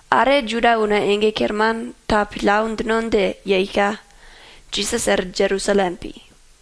Are Juda una ege kerman ta pillau djino dje yeika, Jisas er Jerusalem pi.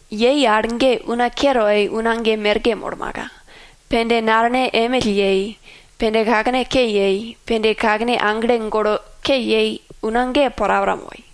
Yei al ge una ke toi una ge merke molmaka, pende nalene emill yei, pende kakene ke yei, pende kakene aglene golo ke yei una ge porapora moi.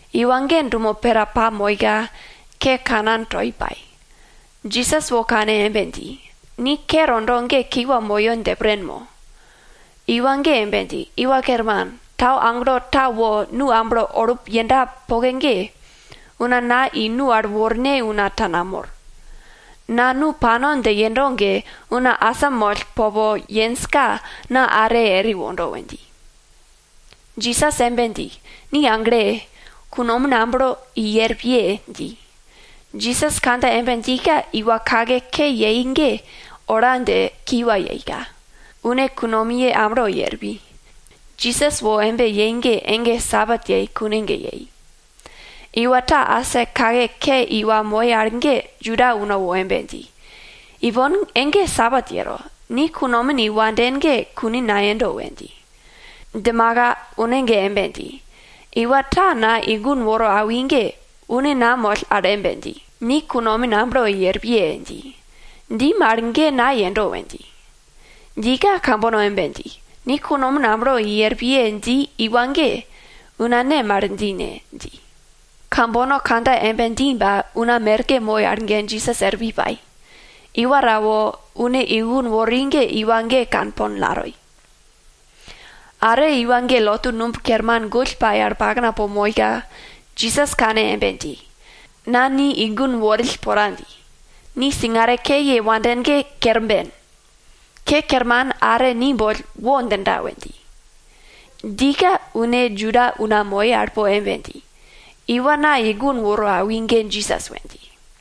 Iwa ge dumo pera pamoika, ke kanan toi pai. Jisas wo kane embe dji, ni ke tondo ge kiwa moyo dje pren mo? Iwa ge embe dji, Iwa Kerman, tau agelo ta wo nu amblo olup yenda poke ge, una na i nu al worne una ta namor. Na nu pano dje yendo ge, una asamoll popo yenjka, na are eri wondo we dji. Jisas embe dji, ni agle! Kunomin amblo i er piye! dji. Jisas kandja embe djika, iwa kake ke yei ge ola dje kiwa yeika, une kunomiye amblo i er pi. Jisas wo embe yei ge ege Sabat yei kune ge yei. Iwa ta asa kake ke yei iwa moi al ge Juda una wo embe dji, ipon ege Sabat yero, ni kunomin i wanden ge kune nayendo we dji. Djimaka une ge embe dji, iwa ta na i gun woro awi ge, une na moll al embe dji, ni kunomin amblo i er piye! dji. Dji mal ge na yendo we dji. Djika kambono embe dji, ni kunomin amblo i er piye dji iwa ge, una ne mal dji ne? dji. Kambono kandja embe dji ba una merke moi al ge Jisas er pi pai, iwa ta wo une i gun wori ge iwa ge kanpol natoi. Are iwa ge lotu numb kerman gull pai al pakna po moika, Jisas kane embe dji, na ni i gun worill pora dji, ni singare ke ye wanden ge kerben. Ke kerman are ni boll wo djinda we dji. Djika une Juda una moi al po embe dji, iwa na i gun woro awi ge Jisas we dji.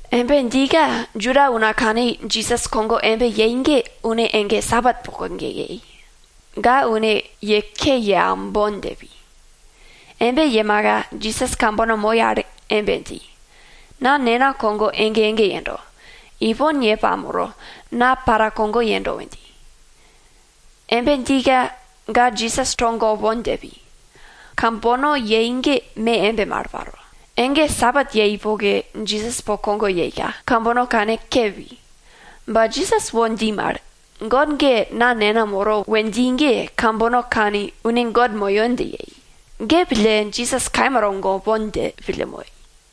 Embe djika Juda una kani Jisas kogo embe yei ge une ege Sabat poke ge yei. Ge pille, ga une ye ke ye aumbon dje pi. Embe yemaka, Jisas kambono moi al embe dji, na Nena kogo ege ege yendo, ipon ye pamoro, na para kogo yendo we dji. Embe djika, ga Jisas togopon dje pi. Kambono yei ge me embe mal pai. Ege Sabat yei poke ge Jisas po kogo yeika, kambono kanke pi. Ba Jisas wo dji mal, God ge na Nena moro we dji ge, kambono kani une God moyo dje yei. Ge pille, Jisas kaima togopon dje pille moi.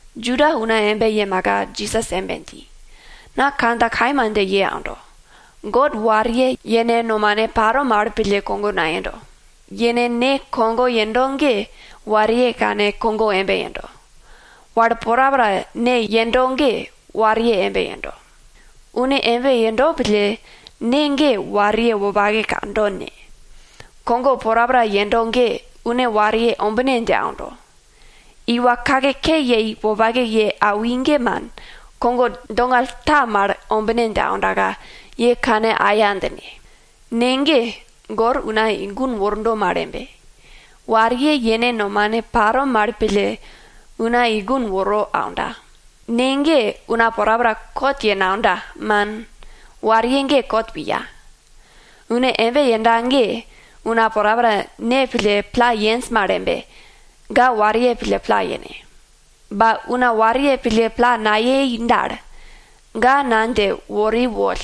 Juda una embe yemaka Jisas embe dji, na kandja kaima dje ye aundo, God wariye yene nomane paro mal pille kogo nayendo. Yene Ne kogo yendo ge wariye kane kogo embe yendo. Wal porapora Ne yendo mal ge, wariye embe yendo. Une embe yendo pille, Ne ge wariye wopake kando ne, kogo porapora yendo ge, une wariye ombine dje aundo. Iwa kake ke yei wopake ye awi ge man, kogo dongall ta mal ombine dje aundaka, ye kane aya djine. Ne ge, gor una i gun wordo mal embe, wariye yene nomane paro mal pille, una i gun woro aunda. Ne ge una porapora kot ye naunda, man, wariye ge kot piya. Une embe yenda ge, una porapora Ne pille pla yenj mal embe, ga wariye pille pla yene. Ba una wariye pille pla nayei dal, ga na dje wori woll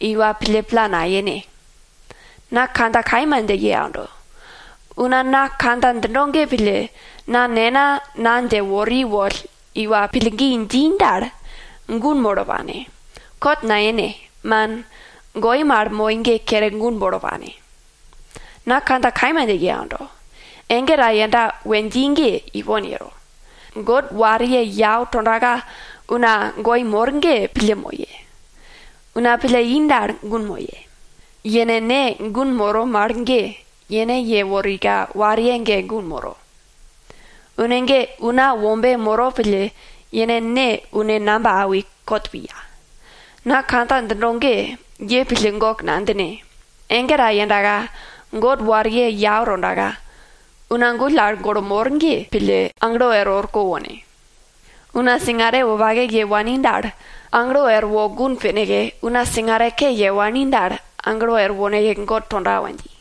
iwa pille pla nayene. Na kandja kaima dje ye aundo, una na kandja djindo ge pille, na Nena na dje wori woll iwa pillgi dji dal, gun molo pane, kot naine, man, goi mal moi ge kere gun molo pane. Na kandja kaima dje ye aundo, ege ta yenda we dji ge ipon yero. God wariye yau tondaka una goi mor ge pille moye. Una pille i dal, gun moye. Yene Ne gun moro mal ge, yene yeworika wariye ge gun moro. Une ge Una Wombe moro pille, yene Ne une namba awi, kot piya. Na kandja djindo ge, ye pille gok nadjine. Ege ta yendaka, God wariye yau tondaka, una gull al golo mor ge pille, aglo er orko wone. Una singare wopake ye wani dal, aglo erwo gun pineke, una singare ke ye wani dal, aglo er woneke God tonda we dji.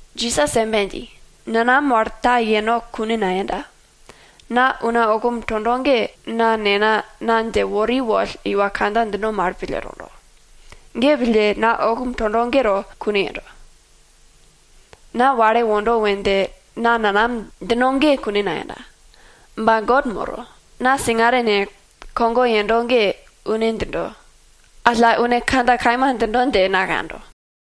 Jisas embe dji, nanam wal ta yeno kune nayenda. Na una okum tondo ge na Nena na dje wori woll iwa kandja djindo mal pille tondo. Ge pille, na okum tondo ge to kune yendo. Na wale wondo we dje na nanam djino ge kune nayenda. Ba God moro. Na singare ne, kogo yendo ge une djindo, alla une kandja kaima djindo dje na kando.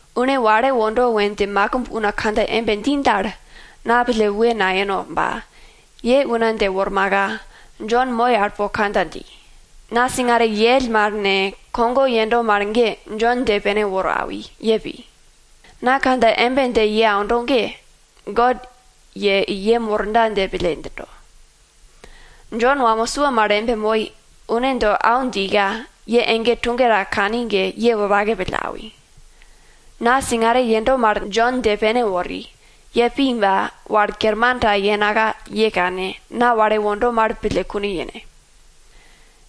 Une wale wondo we dje makimb una kandja embe dji dal, na pille we nayeno ba, ye una dje wormaka, Jon moi al po kandja dji. Na singare yell mal ne, kogo yendo mal ge Jon dje pene woro awi, ye pi. Na kandja embe dje ye aundo ge, God ye i yem worda dje pille djindo. Jon wamo sua mal embe moi, une do au djika, ye ege tuge ta kani ge, ye wopake pille awi. Na singare yendo mal Jon dje pene wori, ye pi ba, wal kerman ta yenaka ye kane, na wale wondo mal pille kune yene.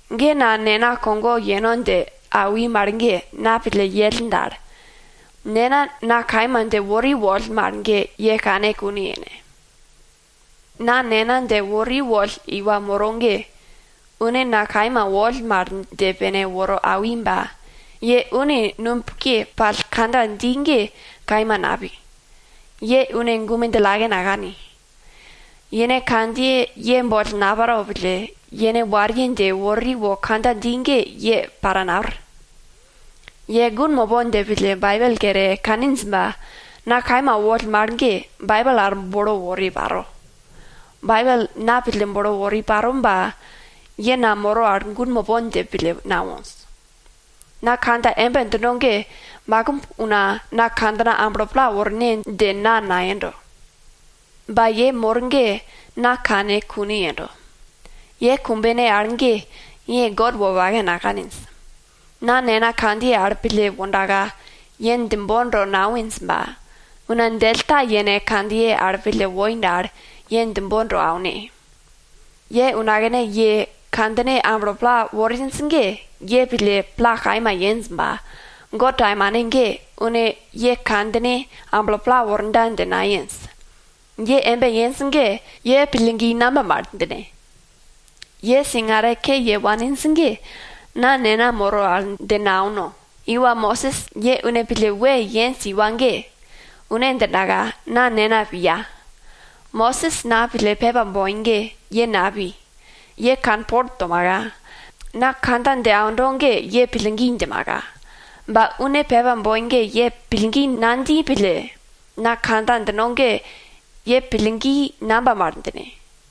Ge na Nena kogo yeno dje awi mal ge, na pille yell dal, Nena na kaima dje wori woll mal ye kane kune yene. Na Nena dje wori woll iwa moro ge, une na kaima woll mal dje pene woro awi ba, ye une nubke pall kandja dji ge kaima napi. Ye une gume djillake nakani. Yene kandjiye ye boll nayero pille, yene wariye dje wori wo kandja dji ge ye para napir. Ye gun mopon dje pille Baibel kere kaninj ba, na kaima woll mal ge, Baibel al bolo wori paro. Baibel na pille bolo wori paro ba, ye na moro al gun mopon dje pille nawonj. Na kandja embe djindo ge makimb una na kandjina amblo pla worne dje na nayendo. Ba ye mor ge na kane kune yendo. Ye kumbene al ge, ye God wopake nakaninj. Na Nena kandjiye al pille wondaka, ye djembon to nawinj ba, una djell ta yene kandjiye al pille woi dal, ye djembon to aune. Ye unakne ye kandjine amblo pla worinj ge, ye pille pla kaima yenj ba, God taimane ge, une ye kandjine amblo pla worda dje nayenj. Ye embe yenj ge, ye pillgi namba mal djine? Ye singare ke ye waninj ge, na Nena moro al dje nauno. Iwa Mosis, ye une pille we yenj iwa ge, une djindaka na Nena piya. Mosis na pille pepa boi ge, ye napi, ye kanpol tomaka, na kandja dje aundo ge ye pillgi djimaka. Ba une pepa boi ge ye pillgi nadji pille, na kandja djindo ge ye pillgi namba mal djine?